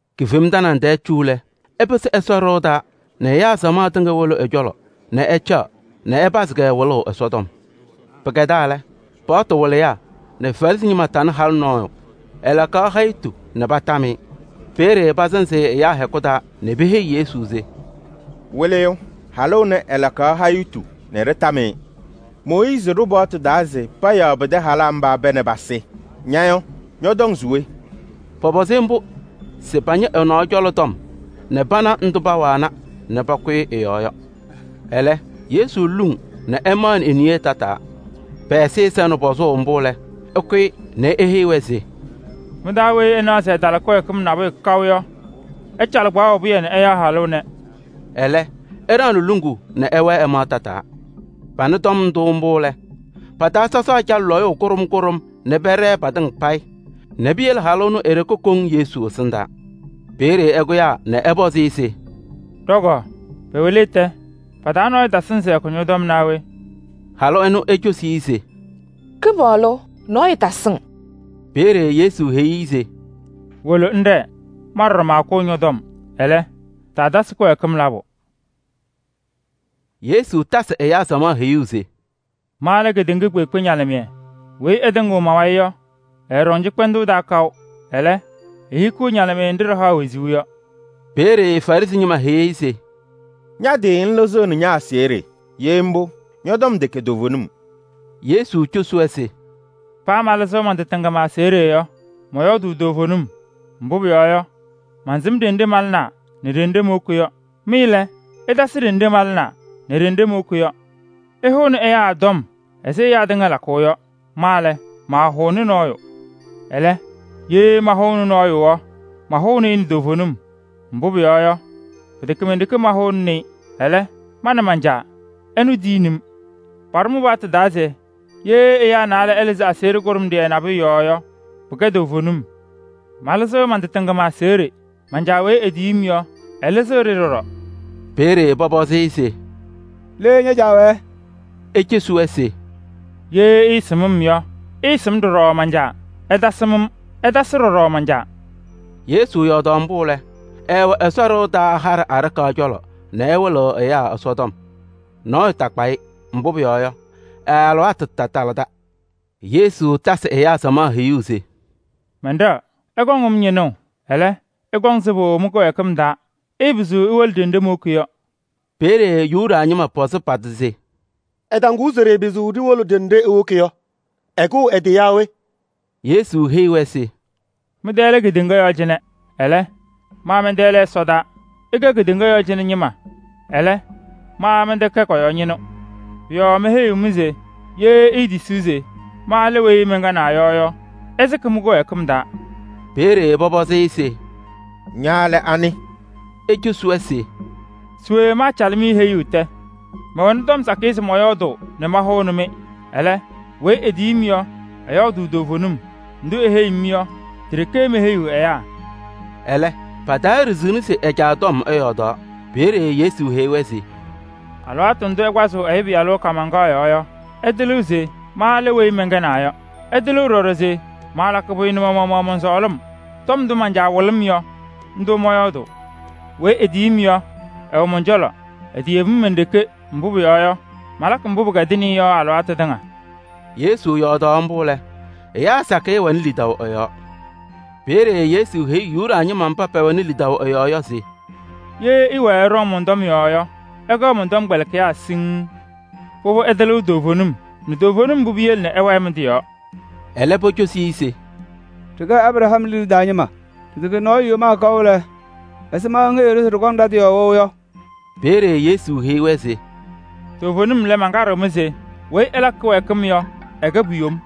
Kifem tanaŋ tɛɛ cu lɛ, ɛpɩsɩ Ɛsɔ ɖɩɣa taa nɛ ɛyaa samaɣ tɩŋa wolo ɛ-cɔlɔ nɛ ɛcaɣ nɛ ɛpazɩ-kɛ wɩlʋʋ Ɛsɔtɔm. Pɩkɛdaa lɛ, Paɣtʋ wɩlɩyaa nɛ Farɩsɩ ñɩma patanɩ halʋ nɔɔyʋ. Ɛlakaɣ hayitu nɛ patam-ɩ. Peeye pasɩnzɩ-ɩ ɛyaa hɛkʋ taa nɛ peheyi Yesu se: “Wɩlɩyʋ! Halʋ ɛnɛ, ɛlakaɣ hayitu nɛ ɖɩtam-ɩ. Mooyiizi ɖʋ paɣtʋ taa se payaɣ pɩtɛ halaa mba pɛɛ nɛ pasɩ. Ña yɔ, ñɔtɔŋ se we?” Pɔpɔzɩ-ɩ mbʋ se pañɩ ɛ-nɔɔ cɔlɔ tɔm nɛ pana ndʋ paawana nɛ pakʋyɩ ɛ-yɔɔ yɔ. Ɛlɛ, Yesu luŋ nɛ ɛmaɣnɩ e-niye tataa. Pɛ-ɛzɩyɛ sɛnɩ pɔzʋʋ mbʋ lɛ, ɛkʋyɩ nɛ eheyi-wɛ se: “Mɩ-taa weyi ɛnaɣ se ɛtala kɩwɛɛkɩm nabʋyʋ kaʋ yɔ, ɛcalɩ kpaɣʋ pɩyɛ nɛ ɛyaɣ halʋ ɛnɛ.” Ɛlɛ ɛɖaɣnɩ luŋuu nɛ ɛwɛɛ ɛmaɣ tataa. Panɩ tɔm ndʋ mbʋ lɛ, pa-taa sɔsaa calɩ lɔyʋʋ kʋɖʋm kʋɖʋm nɛ pɛɖɛɛ patɩŋa payɩ nɛ piyele halʋ ɛnʋ e-ɖeke koŋ Yesu ɛsɩndaa. Peeye ɛkʋyaa nɛ ɛpɔzɩ-ɩ se: “Ɖɔ-kɔɔ, pɛwɛ le tɛ? Pa-taa nɔɔyʋ tasɩŋ se ɛkʋ ñɔ-tɔm naa we?” Halʋ ɛnʋ ecosi-i se: “Kɩpaɣlʋ! Nɔɔyʋ tasɩŋ.” Peeye Yesu heyi-i se: “Wolo ŋɖɛɛ, ma ɖɔɖɔ maakʋʋ ñɔ-tɔm. Ɛlɛ, taatasɩ kɩwɛɛkɩm labʋ.”] Yesu tasɩ ɛyaa samaɣ heyuu se: “Ma lɛ ɛyaa kpeekpe ñalɩmɩyɛ. Weyi ɛtɩŋɩɣ ma-wayɩ yɔ, ɛɛɖɔŋ cɩkpɛndʋʋ taa kaʋ. Ɛlɛ, ehikiɣ ñalɩmɩyɛ nɖɩ ɖɩhaɣ wezuu yɔ.” Peeye Farɩsɩ ñɩma heyi-i se: “Ña-tɩ ŋlɩzɩɣnɩ ña-aseɣɖe! Ye mbʋ, ñɔ-tɔm tɛkɛ toovenim.” Yesu cosi-wɛ se: “Paa malɩzɩɣ man-tɩ tɩŋa ma-aseɣɖe yɔ, mɔyɔɔdʋʋ toovenim. Mbʋ pʋyɔɔ yɔ, mansɩm ɖenɖe malɩnaa nɛ ɖenɖe mowoki yɔ. Mɩ lɛ, ɩtasɩ ɖenɖe malɩnaa nɛ ɖenɖe mowoki yɔ. Ɩhʋʋnɩ ɛyaa tɔm ɛzɩ ɛyaa tɩŋa lakʋʋ yɔ. Ma lɛ, maahʋʋnɩ nɔɔyʋ. Ɛlɛ, ye mahʋʋnɩ nɔɔyʋ yɔ, mahʋʋnɩ-ɩ nɛ toovenim. Mbʋ pʋyɔɔ yɔ, pɩtɛkɛ men-ɖeke mahʋʋnɩnɩ-ɩ, ɛlɛ, ma nɛ man-Caa, ɛnʋ tiyini-m. Paɖʋ mɩ-paɣtʋ taa se: ye ɛyaa naalɛ ɛlɩzɩ aseɣɖe kʋɖʋmɖɩyɛ nabʋyʋ yɔɔ yɔ, pɩkɛɣ toovenim. Malɩzɩɣ man-tɩ tɩŋa ma-aseɣɖe, man-Caa weyi etiyi-m yɔ, ɛlɩzɩɣ-ɖɩ ɖɔɖɔ.” Peeye pɔpɔzɩ-ɩ se: “Le ña-Caa wɛɛ?” Ecosi-wɛ se: “Ye ɩɩsɩm-m yɔ, ɩɩsɩm ɖɔɖɔ man-Caa. Ɩtasɩm-m, ɩtasɩ ɖɔɖɔ man-Caa.” Yesu yɔɔdaɣ mbʋ lɛ, ɛɛwɛ Ɛsɔ ɖɩɣa taa haɖɛ aɖakaɣ cɔlɔ nɛ ɛwɩlɩɣ ɛyaa Ɛsɔtɔm. Nɔɔyʋ taakpa-ɩ, mbʋ pʋyɔɔ yɔ, ɛ-alɩwaatʋ taatalɩda. Yesu tasɩ ɛyaa samaɣ heyuu se: “Mɛnɖɛɣ, ɩkɔŋ-m ñɩnʋʋ. Ɛlɛ, ɩkɔŋ sɩbʋ mɩ-kɩwɛɛkɩm taa. Ɩɩpɩzɩɣ iwolo ɖenɖe mowoki yɔ.” Peeye Yuda ñɩma pɔzɩ pa-tɩ se: “Ɛtɔŋʋʋ se ɖɩɩpɩzɩɣ ɖiwolo ɖenɖe ewoki yɔ, ɛkʋʋ ɛ-tɩ yaa we?” Yesu heyi-wɛ se: “Mɩ-tɛ lɛ kedeŋa yɔɔ cɩnɛ. Ɛlɛ, ma mɛn-tɛ lɛ ɛsɔdaa. Ɩkɛ kedeŋa yɔɔ cɩnɛ ñɩma, ɛlɛ, ma mɛntɛkɛ kɔ-yɔɔ ñɩnʋ. Pʋ-yɔɔ meheyi-mɩ se ye itetisi se: ‘Ma lɛ weyi mɛnkɛnaa yɔ’ yɔ, ɩsɩkɩ mɩ-kɩwɛɛkɩm taa.” Peeye pɔpɔzɩ-ɩ se: “Ña lɛ anɩ?” Ecosi-wɛ se: “Se we maacalɩ-mɩ heyuu tɛ? Mɛwɛnɩ tɔm sakɩyɛ se mɔyɔɔdʋʋ nɛ mahʋnɩ-mɩ. Ɛlɛ, weyi etiyi-m yɔ, ɛyɔɔdʋʋ toovenim. Ndʋ eheyi-m yɔ, ti-ɖeke meheyiɣ ɛyaa.” Ɛlɛ, pataaɖiɣzini se ɛ-Caa tɔm ɛyɔɔdaɣ. Peeye Yesu heyi-wɛ se: “Alɩwaatʋ ndʋ ɩkpazɩɣ Ɛyʋ Pɩyalʋ kaamaŋkaɣ yɔɔ yɔ ɩtɩlɩɣ se: ‘Ma lɛ weyi mɛnkɛnaa yɔ.’ Ɩtɩlɩɣ ɖɔɖɔ se maalakɩ pʋyʋ nɛ ma-maɣmaɣ mɔn-sɔɔlɩm: tɔm ndʋ man-Caa wɩlɩ-m yɔ, ndʋ mɔyɔɔdʋʋ. Weyi etiyi-m yɔ, ɛwɛ mɔn-cɔlɔ, eteyebi-m men-ɖeke. Mbʋ pʋyɔɔ yɔ, malakɩ mbʋ pɩkɛdɩnɩ-ɩ yɔ alɩwaatʋ tɩŋa.” Yesu yɔɔdaɣ mbʋ lɛ, ɛyaa sakɩyɛ wɛnɩ lidaʋ ɛ-yɔɔ. Peeye Yesu heyi Yuda ñɩma mba pɛwɛnɩ lidaʋ ɛ-yɔɔ yɔ se: “Ye ɩwɛɛ ɩɖɔŋ mɔn-tɔm yɔɔ yɔ, ɩkɛɣ mɔn-tɔmkpɛlɩkɩyaa siŋŋ. Pʋbʋ, ɩtɩlɩɣ toovenim nɛ toovenim mbʋ piyele ɩwɛɛ mɩ-tɩ yɔɔ.” Ɛlɛ pocosi-i se: “Ɖɩkɛ Abraham liɖe taa ñɩma. Ɖɩtɛkɛ nɔɔyʋ yomaa kaʋ lɛ, ɛzɩma ŋheyiɣ-ɖʋ se ɖɩkɔŋ ɖa-tɩ yɔɔ wɛʋ yɔ?” Peeye Yesu heyi-wɛ se: “Toovenim lɛ, mankaɖɩɣ-mɩ se: weyi ɛlakɩ kɩwɛɛkɩm yɔ, ɛkɛ pu-yom.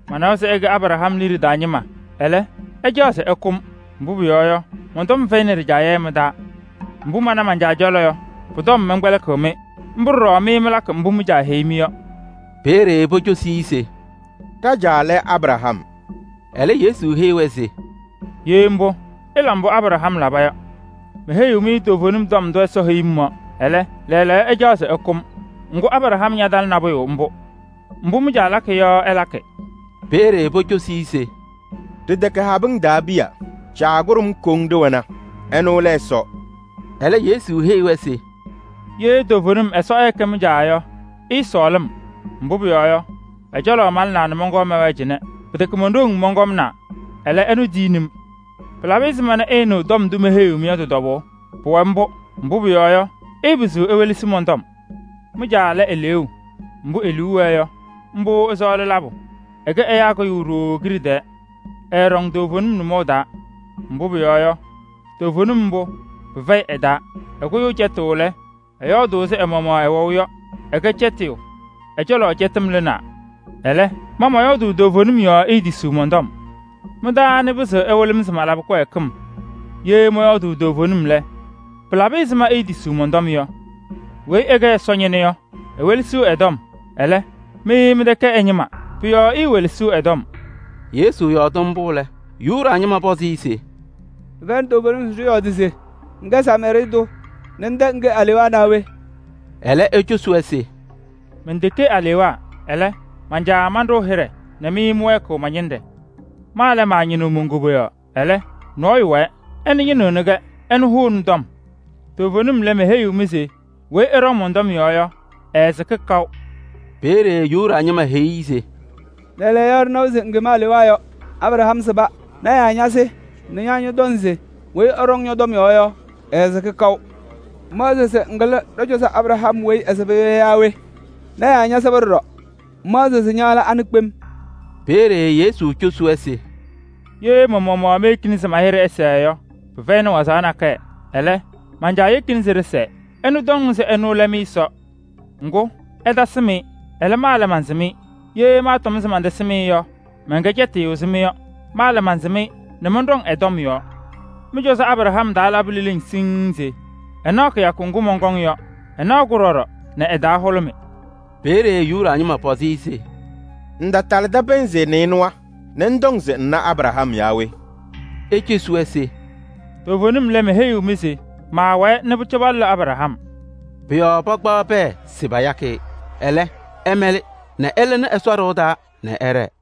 Manawa se ɩkɛ Abraham liɖe taa ñɩma. Ɛlɛ, ɩcaɣ se ɩkʋ-m, mbʋ pʋyɔɔ yɔ, mɔn-tɔm fɛyɩnɩ ɖɩjaɣyɛ mɩ-taa. Mbʋ mana man-Caa cɔlɔ yɔ, pʋ-tɔm mɛnkɛdɩɣ-mɩ. Mbʋ ɖɔɖɔ mɩ mɩlakɩ mbʋ mɩ-caa heyi-mɩ yɔ.” Peeye pocosi-i se: “Ɖa-caa lɛ Abraham.” Ɛlɛ Yesu heyi-wɛ se: “Ye mbʋ, ɩla mbʋ Abraham laba yɔ. Meheyi-mɩ toovenim tɔm ndʋ Ɛsɔ heyi-m yɔ, ɛlɛ, lɛɛlɛɛyɔ ɩcaɣ se ɩkʋ-m. Ŋgʋ, Abraham ñatala nabʋyʋ mbʋ. Mbʋ mɩ-caa lakɩ yɔ ɩlakɩ.” Peeye pocosi-i se: “Ɖɩtɛkɛ habɩŋ taa piya, Caa kʋɖʋm koŋ ɖɩwɛna, ɛnʋ lɛ Ɛsɔ.” Ɛlɛ Yesu heyi-wɛ se: “Ye toovenim Ɛsɔ ɛɛkɛ mɩ-Caa yɔ, ɩɩsɔɔlɩ-m. Mbʋ pʋyɔɔ yɔ, ɛ-cɔlɔ malɩnaa nɛ mɔnkɔɔ mɛwɛɛ cɩnɛ. Pɩtɛkɛ mon-ɖoŋ mɔnkɔmnaa, ɛlɛ, ɛnʋ tiyini-m. Pɩlabɩ ɛzɩma nɛ ɩɩnɩɣ tɔm ndʋ meheyiɣ-mɩ yɔ tɩ-tɔbʋʋ? Pʋwɛ mbʋ, mbʋ pʋyɔɔ yɔ, ɩɩpɩzɩɣ iwelesi mɔn-tɔm. Mɩ-caa lɛ eleeu. Mbʋ e-liu wɛɛ yɔ, mbʋ ɩsɔɔlɩ labʋ. Ɛkɛ ɛyaa kʋyʋ ɖooo kiɖe tɛɛ. Ɛɛɖɔŋ toovenim nʋmɔʋ taa, mbʋ pʋyɔɔ yɔ, toovenim mbʋ, pɩfɛyɩ ɛ-taa. Ɛkʋyʋʋ cɛtʋʋ lɛ, ɛyɔɔdʋʋ ɛzɩ ɛ-maɣmaɣ ɛwɛʋ yɔ: ɛkɛ cɛtɩyʋ, ɛ-cɔlɔ cɛtɩm lɩɣna. Ɛlɛ, ma mɔyɔɔdʋʋ toovenim yɔɔ iitisiɣ mɔn-tɔm. Mɩ-taa anɩ pɩzɩɣ ɛwɩlɩ-m se malabɩ kɩwɛɛkɩm? Ye mɔyɔɔdʋʋ toovenim lɛ, pɩlabɩ ɛzɩma iitisiɣ mɔn-tɔm yɔ? Weyi ɛkɛ Ɛsɔ ñɩnʋ yɔ, ewelesiɣ ɛ-tɔm. Ɛlɛ, mɩ mɩtɛkɛ ɛ-ñɩma, pʋ-yɔɔ iiwelesiɣ ɛ-tɔm.” Yesu yɔɔdɩ mbʋ lɛ, Yuda ñɩma pɔzɩ-ɩ se: “Ɖɩfɛyɩnɩ toovenim se ɖɩyɔɔdɩ se ŋkɛ Samaarɩɩ tʋ nɛ ŋtɛ ŋke alewaa naa we?” Ɛlɛ ecosi-wɛ se: “Menteke alewaa, ɛlɛ, man-Caa manɖʋʋ hɩɖɛ nɛ mɩ mɩwɛɛkɩɣ ma-ñɩnɖɛ! Ma lɛ, maañɩnɩɣ mon-koboyaɣ. Ɛlɛ, nɔɔyʋ wɛɛ, ɛnʋ ñɩnɩɣnɩ-kɛ, ɛnʋ hʋʋnɩ tɔm. Toovenim lɛ, meheyiɣ-mɩ se: weyi ɛɖɔŋ mɔn-tɔm yɔɔ yɔ, ɛɛsɩkɩ kaʋ.” Peeye Yuda ñɩma heyi-i se: “Lɛɛlɛɛyɔ ɖɩnawa se ŋkem alewaa yɔ! Abraham sɩba, lɔɔyɩsɩ tɩnaa ñasɩ nɛ ña ñɔtɔŋ se weyi ɛɖɔŋ ñɔ-tɔm yɔɔ yɔ, ɛɛsɩkɩ kaʋ! Ŋmaɣzɩɣ se ŋkɩlɩ ɖɔ-cɔzɔ Abraham weyi ɛsɩba yɔ yaa we? Lɔɔyɩsɩ tɩnaa ñasɩba ɖɔɖɔ, ŋmaɣzɩɣ se ña lɛ anɩ kpem?” Peeye Yesu cosi-wɛ se: “Ye ma-maɣmaɣ meyekini se ma-hɩɖɛ ɛsɛɛ yɔ, pɩfɛyɩnɩ waɣzaɣ nakɛyɛ. Ɛlɛ, man-Caa yekini se ɖɩsɛɛ. Ɛnʋ ɩtɔŋ se ɛnʋ lɛ mɩ-Ɛsɔ. Ŋgʋ, ɩtasɩm-ɩ. Ɛlɛ, ma mansɩm-ɩ. Ye maatɔm se mantasɩm-ɩ yɔ, maakɛ cɛtɩyʋ ɛzɩ mɩ yɔ. Ma lɛ, mansɩm-ɩ nɛ mɔnɖɔŋ ɛ-tɔm yɔɔ. Mɩ-cɔzɔ Abraham taa labɩ leleŋ siŋŋ se ɛnaɣ kɩyakʋ ŋgʋ mɔnkɔŋ yɔ. Ɛna-kʋ ɖɔɖɔ nɛ ɛ-taa hʋlʋmɩ.” Peeye Yuda ñɩma pɔzɩ-ɩ se: “Ŋtatalɩdɩ pɩnzɩ nɩɩnʋwa nɛ ŋtɔŋ se ŋna Abraham yaa we?” Ecosi-wɛ se: “Toovenim lɛ, meheyiɣ-mɩ se maawɛɛ nɛ pʋcɔ palʋlɩ Abraham.” Pʋ-yɔɔ pakpaɣ pɛɛ se payakɩ-ɩ. Ɛlɛ, ɛmɛlɩ nɛ ɛlɩnɩ Ɛsɔ ɖɩɣa taa nɛ ɛɖɛɛ.